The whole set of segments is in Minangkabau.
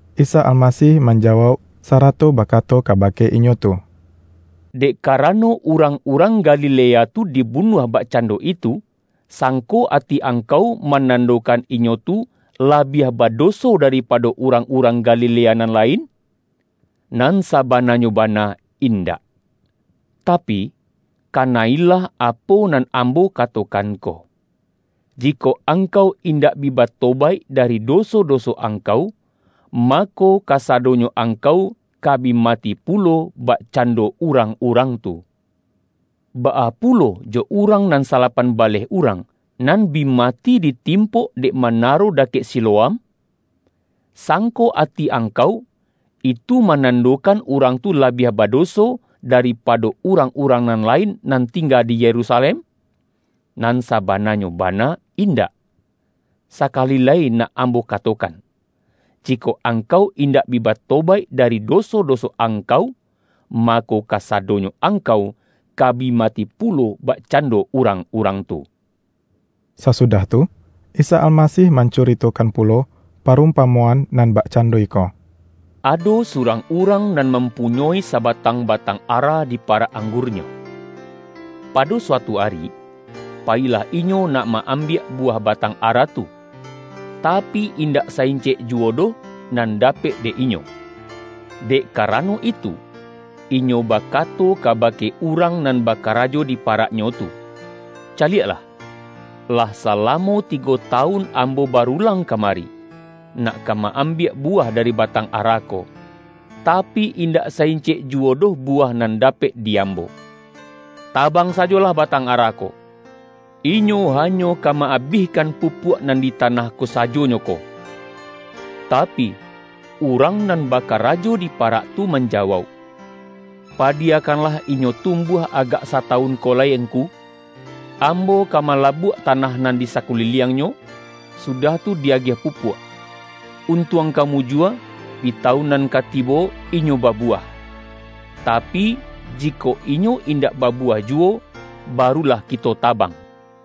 Isa Almasih manja-wauk, sarato bakato kabake inyo tu,”Dek karano urang-urang Galilea tu dibunuah bakcando itu, sangko ati angkau manandokan inyo tu labiah badoso daripado urang-urang Gali-lea nan lain? Nan sabananyo bana, indak! Tapi, kana-ilah apo nan Ambo katokan ko: jikok angkau indak bi ba-tobaik dari doso-doso angkau, mako, kasadonyo angkau ka bi mati pulo, bakcando urang-urang tu. Baa pulo jo urang nan salapan baleh urang, nan bi mati ditimpok dek manaro dakek Si-loam? Sangko ati angkau, itu manan-dokan urang tu labiah badoso, daripa-do urang-urang nan lain nan tingga di Yerusalem? Nan sabananyo ba-na, indak! Sakali lai nak Ambo kato-kan: Jikok angkau indak bi batobaik dari doso-doso angkau, mako, kasa-donyo angkau, ka bi mati pulo bak-cando urang-urang tu.” Sasudah tu, Isa Almasih mancuri-tokan pulo parumpamoan nan bakcan-do iko,”Ado surang urang nan mam-punyoi sabatang batang ara di parak anggurnyo. Pado suatu ari, payilah inyo nak ma-ambiak buwah batang ara tu, tapi, indak sa-incek juwo doh nan dapek dek inyo. Dek karano itu, inyo bakato kabake urang nan bakarajo di paraknyo tu, ’Caliaklah, lah sala-mo tigo tawun ambo barulang kamari, nak ka ma-ambiak buwah dari batang ara ko, tapi, indak sa-incek juwo doh buwah nan dapek di ambo. Tabang sajolah batang ara ko! Inyo hanyo ka ma-abihkan pupuak nan di tanah ko sajonyo ko!' Tapi, urang nan baka-rajo di parak tu manjawauk, ’Padiya-kanlah inyo tumbuah agak satawun ko lai ngku. Ambo ka malabuak ta-nah nan di sakuliliangnyo, sudah tu di-agiah pupuak. Untuang ka mujua, di tawun nan ka tibo inyo babuwah. Tapi, jikok inyo indak babuwah juwo, barulah kito tabang.’”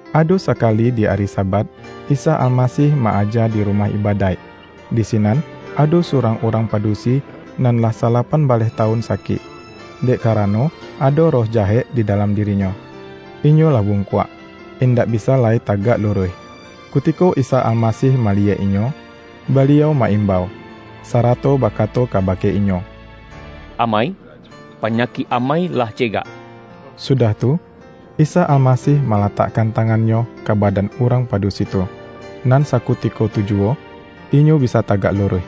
Ado sakali di ari Sabat, Isa Almasih ma-aja di rumah ibadaik. Di sinan ado surang urang padusi nan lah sa-lapan baleh tawun sakik, dek karano ado roh jahek di dalam dirinyo. Inyo lah bungkuak, indak bisa lai tagak lu-ruih. Kutiko Isa Almasih maliyek inyo, Baliau ma-imbau, sarato bakato kabake inyo,”Amai, panyakik amai lah cegak!” Sudah tu, Isa Almasih ma-latakkan tangan-Nyo ka badan urang padusi tu, nan sakutiko tu juwo, inyo bisa tagak luruih,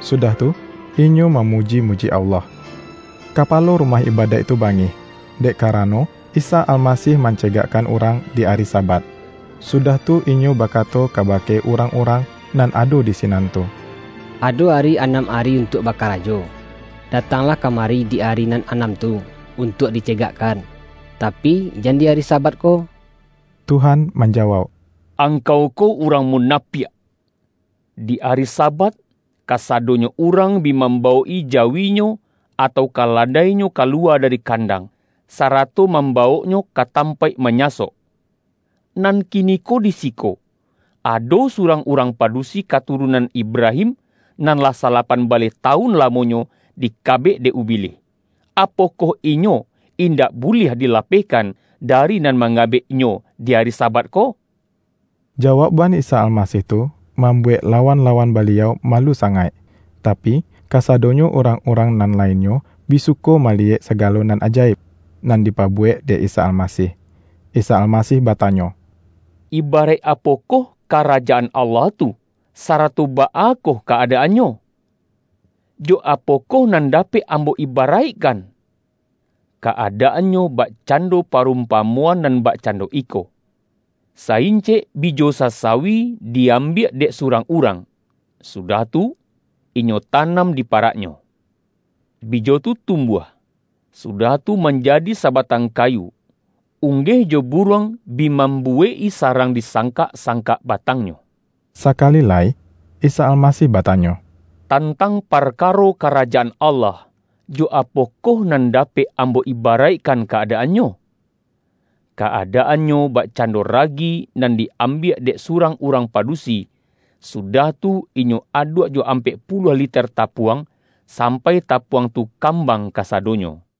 sudah tu inyo ma-muji-muji Allah. Kapalo rumah ibadaik tu bangih, dek karano Isa Almasih mancegakkan urang di ari Sabat, sudah tu inyo ba-kato kabake urang-urang nan ado di sinan tu,”Ado ari anam ari untuak ba-karajo; datanglah kamari di ari nan anam tu untuak di cegakkan, tapi, jan di ari Sabat ko!” Tuhan manjawauk,”Angkau ko urang munapiak! Di ari Sabat, kasa-donyo urang bi mambawok-i jawinyo, atau kaladainyo kaluwa dari kandang, sarato mambawoknyo ka tampaik ma-nyasok. Nan kiniko di siko, ado su-rang urang padusi katurunan Ibrahim, nan lah salapan baleh tawun lamonyo, dikabek dek Ubilih. Apokoh inyo indak buliah dilapehkan, dari nan mangabek-nyo di ari Sabat ko?” Jawaukban Isa Almasih tu, mambuwek lawan-lawan Baliau malu sangaik; tapi, kasadonyo urang-urang nan lainnyo bi suko ma-liyek sagalo nan ajaib, nan dipabuwek dek Isa Almasih. Isa Almasih batanyo,”Ibaraik apo-koh Karajaan Allah tu, sarato baa koh ka-adaannyo? Jo apokoh nan dapek Ambo ibaraikkan? Ka-adaannyo bak-cando parumpamoan nan bakcando iko. Sa-incek bijo sasawi di-ambiak dek surang urang, sudah tu, inyo tanam di paraknyo. Bijo tu tumbuah, sudah tu, manjadi sabatang kayu, unggeh jo bu-ruang bi mambuwek-i sarang disang-kak-sangkak batangnyo.” Sakali lai Isa Almasih batanyo,”Tantang parkaro Karajaan Allah, jo apokoh nan dapek Ambo ibaraikkan ka-adaannyo? Ka-adaannyo bak-cando ragi, nan di-ambiak dek surang urang padusi, sudah tu, inyo aduak jo ampek puluah liter tapuang, sampai tapuang tu kambang kasadonyo.”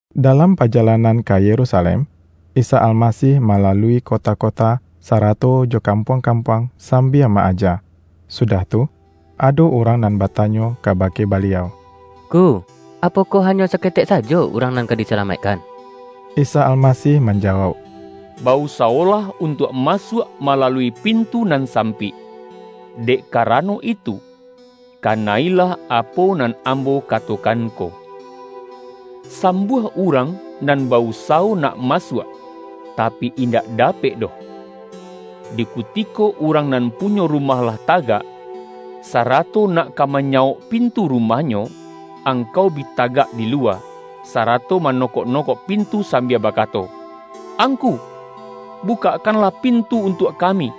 Dalam pajalanan ka Yerusalem, Isa Almasih malalui kota-kota, sarato jo kampuang-kampuang sambia ma-aja. Sudah tu, ado urang nan ba-tanyo kabake Baliau,”Ngku, apokoh hanyo saketek sajo urang nan ka di-salamaikkan?” Isa Almasih manjawauk, ”Ba-usa-wolah untuak masuak malalui pintu nan sampik. Dek karano itu, kana-ilah apo nan Ambo katokan ko! Sambuah urang nan ba-usawo nak masuak, tapi indak dapek doh. Di kutiko urang nan punyo rumah lah tagak, sarato nak ka manyawok pintu rumahnyo, angkau bi tagak di luwa, sarato mano-kok-nokok pintu sambia bakato, ’Ang-ku, bukakkanlah pintu untuak kami!'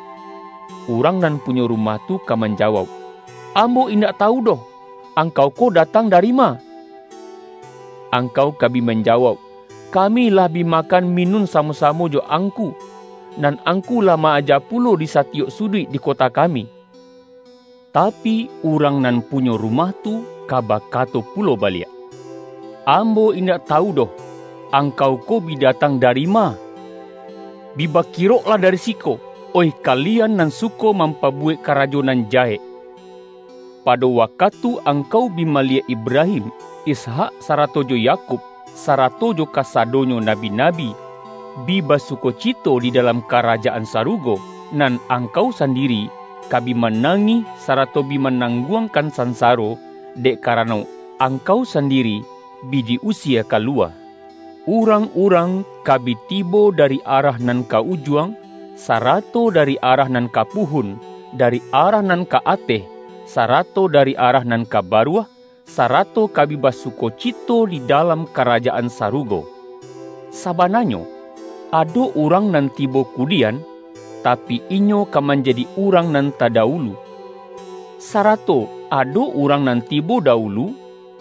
Urang nan punyo rumah tu ka manja-wauk, ’Ambo indak tawu doh, angkau ko datang dari ma!' Angkau ka bi manjawauk, ’ Kami lah bi makan mi-nun samo-samo jo Angku, nan Angku lah ma-aja pulo di satiyok suduik di ko-ta kami!' Tapi, urang nan punyo ru-mah tu, ka bakato pulo baliak, ’Ambo indak tawu doh, angkau ko bi datang dari ma? Bi bakiroklah dari siko, oih kalian nan suko mampabuwek karajo nan jahek!' Pado wakatu angkau bi maliyek Ibrahim, Ishak sarato jo Yakub, sarato jo kasadonyo nabi-nabi, bi basu-kocito di dalam Karajaan Sarugo, nan angkau sandiri ka bi manangih, sarato bi manangguangkan sansaro, dek ka-rano, angkau sandiri bi di usie ka lu-wa! Urang-urang ka bi tibo dari arah nan ka Ujuang, sarato dari arah nan ka Puhun, dari arah nan ka Ateh, sarato dari arah nan ka Baruah, sarato ka bi basukocito di dalam Karajaan Sarugo. Sabananyo, ado urang nan tibo ku-dian, tapi, inyo ka manjadi urang nan tadawulu, sarato ado urang nan tibo dawulu,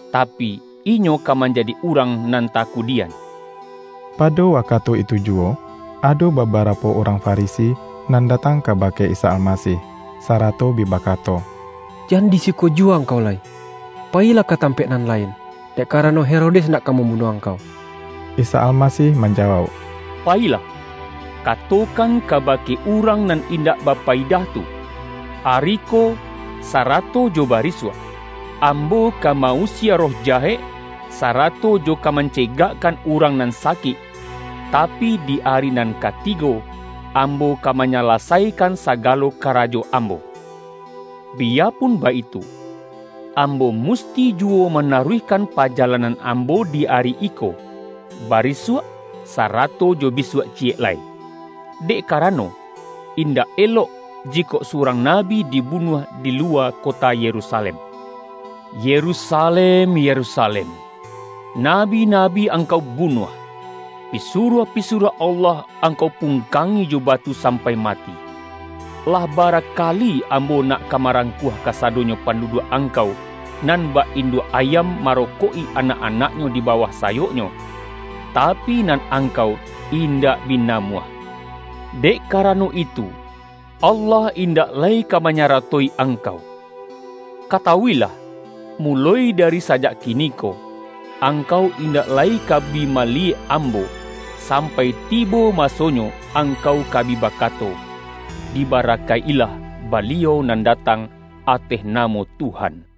tapi, inyo ka manjadi urang nan takudian.” Pado wakatu itu juwo, ado baba-rapo urang Farisi nan datang kabake Isa Almasih, sarato bi bakato,”Jan di siko juwo Angkau lai! Payilah ka tam-paik nan lain, dek karano, Herodes nak ka mambunuah Angkau.” Isa Almasih manjawauk,”Payi-lah katokan kabake urang nan indak bapayidah tu, ’Ari ko, sarato jo bari-suak, Ambo ka ma-usie roh jahek, sa-rato jo ka mancegakkan urang nan sa-kik, tapi, di ari nan katigo, Ambo ka manyalasaikan sagalo karajo Ambo.’ Biyapun baitu, Ambo musti juwo manaruihkan pajalanan Ambo di ari iko, barisuak sarato jo bisuak ciyek lai. Dek karano, indak elok, jikok su-rang nabi dibunuah di luwa kota Ye-rusalem. Yerusalem, Yerusalem! Nabi-na-bi angkau bunuah! Pisuruah-pisuruah Allah, angkau pungkangi jo batu sam-pai mati! Lah bara kali Ambo nak ka marangkuah kasadonyo panduduak angkau, nan bak induak ayam maro-kok-i anak-anaknyo di bawah sayok-nyo, tapi, nan angkau indak bi na-muah! Dek karano itu, Allah indak lai ka manyarato-i angkau. Katawu-ilah, muloi dari sajak kiniko, angkau indak lai ka bi maliyek Ambo, sam-pai tibo masonyo angkau ka bi baka-to, ’Dibarakaik-ilah Baliau nan datang ateh namo Tuhan.’”